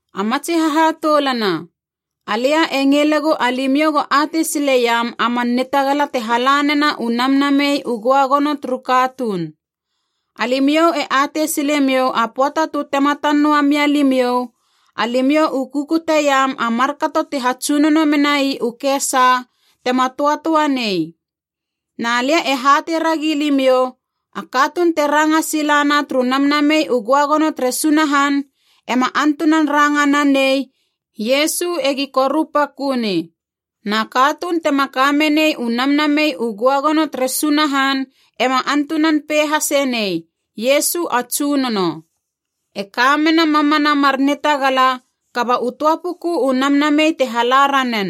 A matsi hahatoulana, alia e ngilegu alimiou go atei sileiam a man nitagala te hala nena u Namnamei u Göagono turu katuun. Alimiou e atei silemiou a pöata tu tematan noa mia limiou, alimiou u kukuteiam a markato ti hatsunono menai u kesa tema töatöa nei. Na lia e hatei ragi limiou, a katuun te ranga sila na turu Namnamei u Göagono tere Sunahan ema antunan ranga nanei, “Iesu egi korupaköni.” Na katuun tema kamenei u Namnamei u Göagono tere Sunahan ema antunan pei hase nei, “Iesu a Tsunono.” E kamena mamana mar nitagala, kaba u töa puku u Namnamei te hala ranen.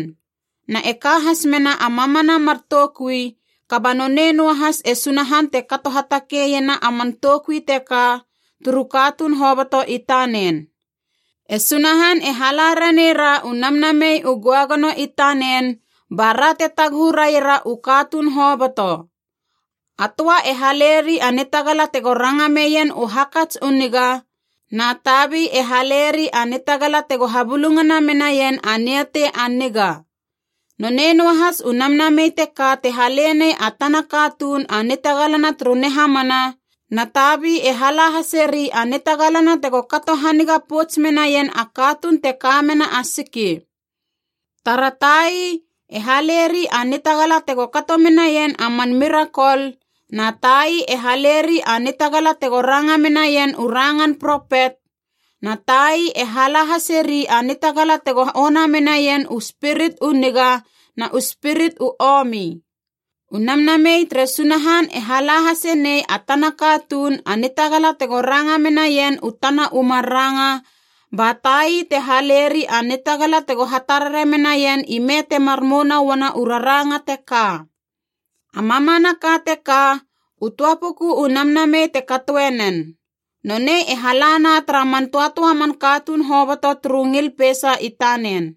Na e ka has mena a mamana mar toukui kaba nonei noahas e Sunahan te kato hatakeiena a man toukui teka turu katuun hoboto i tanena E Sunahan e hala ranei ra u Namnamei u Göagono i tanen bara te taguhu raiera u katuun hoboto. A töa e haleri a nitagala tego ranga meien u hakats u niga, na tabi e haleri a nitagala tego habulungana menaien a niatei a niga. Nonei noahas u Namnamei teka te halenei a tana katuun a nitagalana turu nihamana, na tabi e hala haseri a nitagalana tego kato haniga pouts menaien a katuun te ka mena a siki. Tara tai, e haleri a nitagala tego kato menaien a man mirakol, na tai e haleri a nitagala tego ranga menaien u rangan propet, na tai e hala haseri a nitagala tego ona menaien u spirit u niga na u spirit u omi. U Namnamei tere Sunahan e hala hasenei a tana katuun a nitagala tego ranga menaien u tana u mar ranga ba tai te haleri a nitagala tego hatarare menaien ime temar mouna uana u raranga teka. A mamanaka teka, u töa puku u Namnamei te katoenen. Nonei e halana tara man tötöa man katuun hoboto turu ngil peisa i tanen.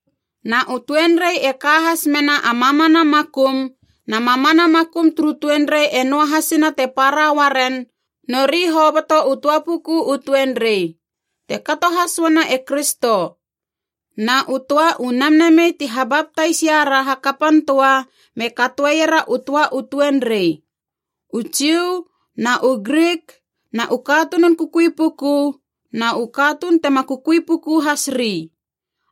Na u tuenrei e ka has mena a mamana makum, na mamana makum turu tuenrei e noahasina te para uaren, nori hoboto u töa puku u tuenrei. Te kato has uana e Kristo. Na u töa u Namnamei ti habaptais iara hakapan töa me katoeiera u töa u tuenrei. U Jiu, na u Grik, na u katunun kukui puku, na u katuun tema kukui puku has ri.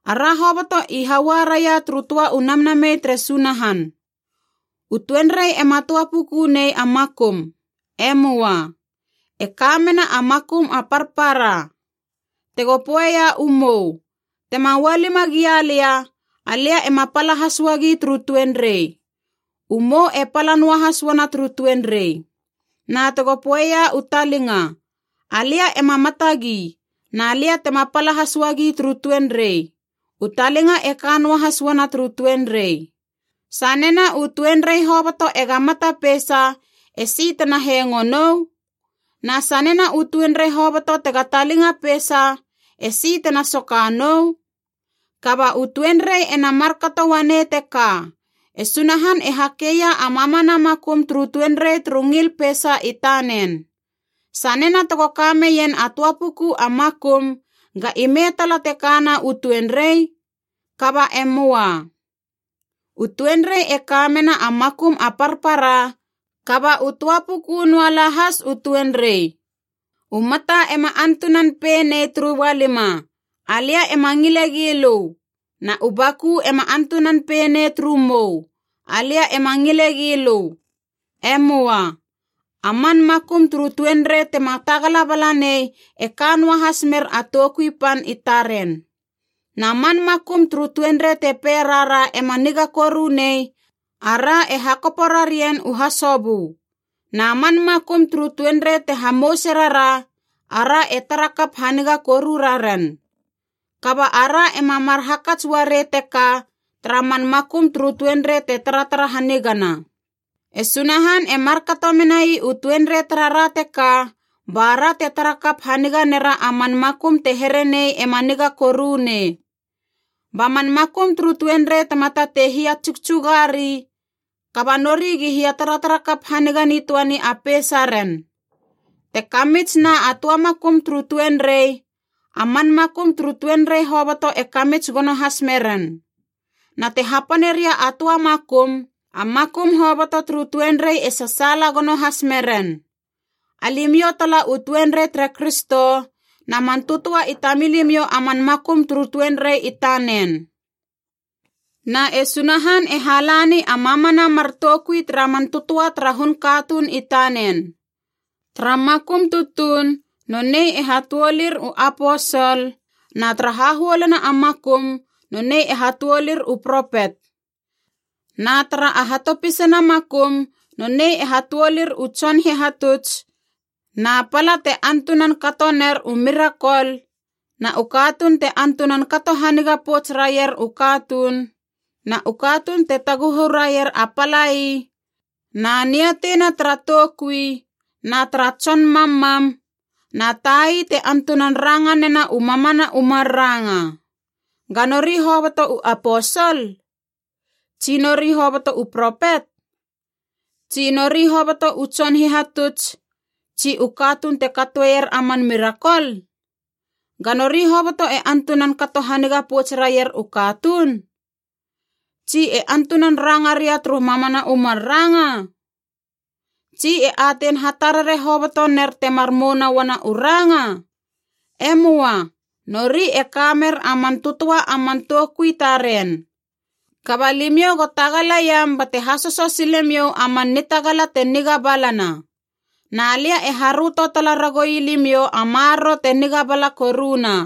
Ara hoboto i haua raia turu töa u Namnamei tere Sunahan. U tuenrei ema töa puku nei a makum. E möa. E ka mena a makum a parpara. Tego poeia u mou, “Tema ualima gia lia, alia ema pala has uagi turu tuenrei,” u mou e pala noahas uana turu tuenrei. Na tego poeia u talinga, “Alia ema matagi na lia tema pala has uagi turu tuenrei,” u talinga e ka noahas uana turu tuenrei. Sanena u tuenrei hoboto ega mata peisa, esi tena hengo nou? Na sanena u tuenrei hoboto tega talinga peisa, esi tena soka nou? Kaba u tuenrei ena markato uanei teka, e Sunahan e hakeia a mamana makum turu tuenrei turu ngil peisa i tanen. Sanena tego ka meien a töa puku a makum, ga ime tala te kana u tuenrei? Kaba e möa. U tuenrei e ka mena a makum a parpara, kaba u töa puku noalahas u tuenrei. U mata ema antunan pei nei turu ualima, “Alia ema ngile gi lö.” Na u baku ema antunan pei nei turu mou, “Alia ema ngile gi lö.” E möa. A man makum turu tuenrei tema tagala bala nei e ka noahas mer a toukui pan i taren. Na man makum turu tuenrei te pei rara ema niga koru nei, ara e hakopo rarien u hasobö. Na man makum turu tuenrei te hamouse rara, ara e tara kap haniga koru raren. Kaba ara ema mar hakats uarei teka tara man makum turu tuenrei te taratara hanigana. E Sunahan e markato menai u tuenrei tarara teka, ba ra te tarakap haniga nera a man makum te here nei ema niga koru nei. Ba man makum turu tuenrei tema tatei hia tsugtsuga ri, kaba nori gi hia taratara kap haniga nitöani a peisa ren. Te kamits na a töa makum turu tuenrei, a man makum turu tuenrei hoboto e kamits gono has meren. Na te hapane ria a töa makum, a makum hoboto turu tuenrei e sasaala gono has meren. Alimiou tala u tuenrei tere Kristo, na man tötöa i tamilimou a man makum turu tuenrei i tanen. Na e Sunahan e halani a mamana mar toukui tara man tötöa tara hun katuun i tanen. Tara makum tutuun nonei e hatuolir u aposol, na tara hahuoluna a makum nonei e hatuolir u propet, na tara a hatopisana makum nonei e hatuolir u tson hihatuts, na pala te antunan katoner u mirakol, na u katuun te antunan kato haniga pouts raier u katuun, na u katuun te taguhu raier a palai, na niatei na tara toukui na tara tson mammam, na tai te antunan ranga nena u mamana u mar ranga. Ga nori hoboto u aposol? Tsi nori hoboto u propet? Tsi nori hoboto u tson hihatuts, tsi u katuun te katoeier a man mirakol? Ga nori hoboto e antunan kato haniga pouts raier u katuun? Tsi e antunan ranga ria turu mamana u mar ranga? Tsi e atein hatarare hoboto ner temar mouna uana u ranga? E möa, nori e ka mer a man tötöa a man toukui taren. Kaba limiou go tagalaiam bate hasoso sile miou a man nitagala te niga balana. Na lia e haröto tala ragoui limiou a maroro te niga bala koruna.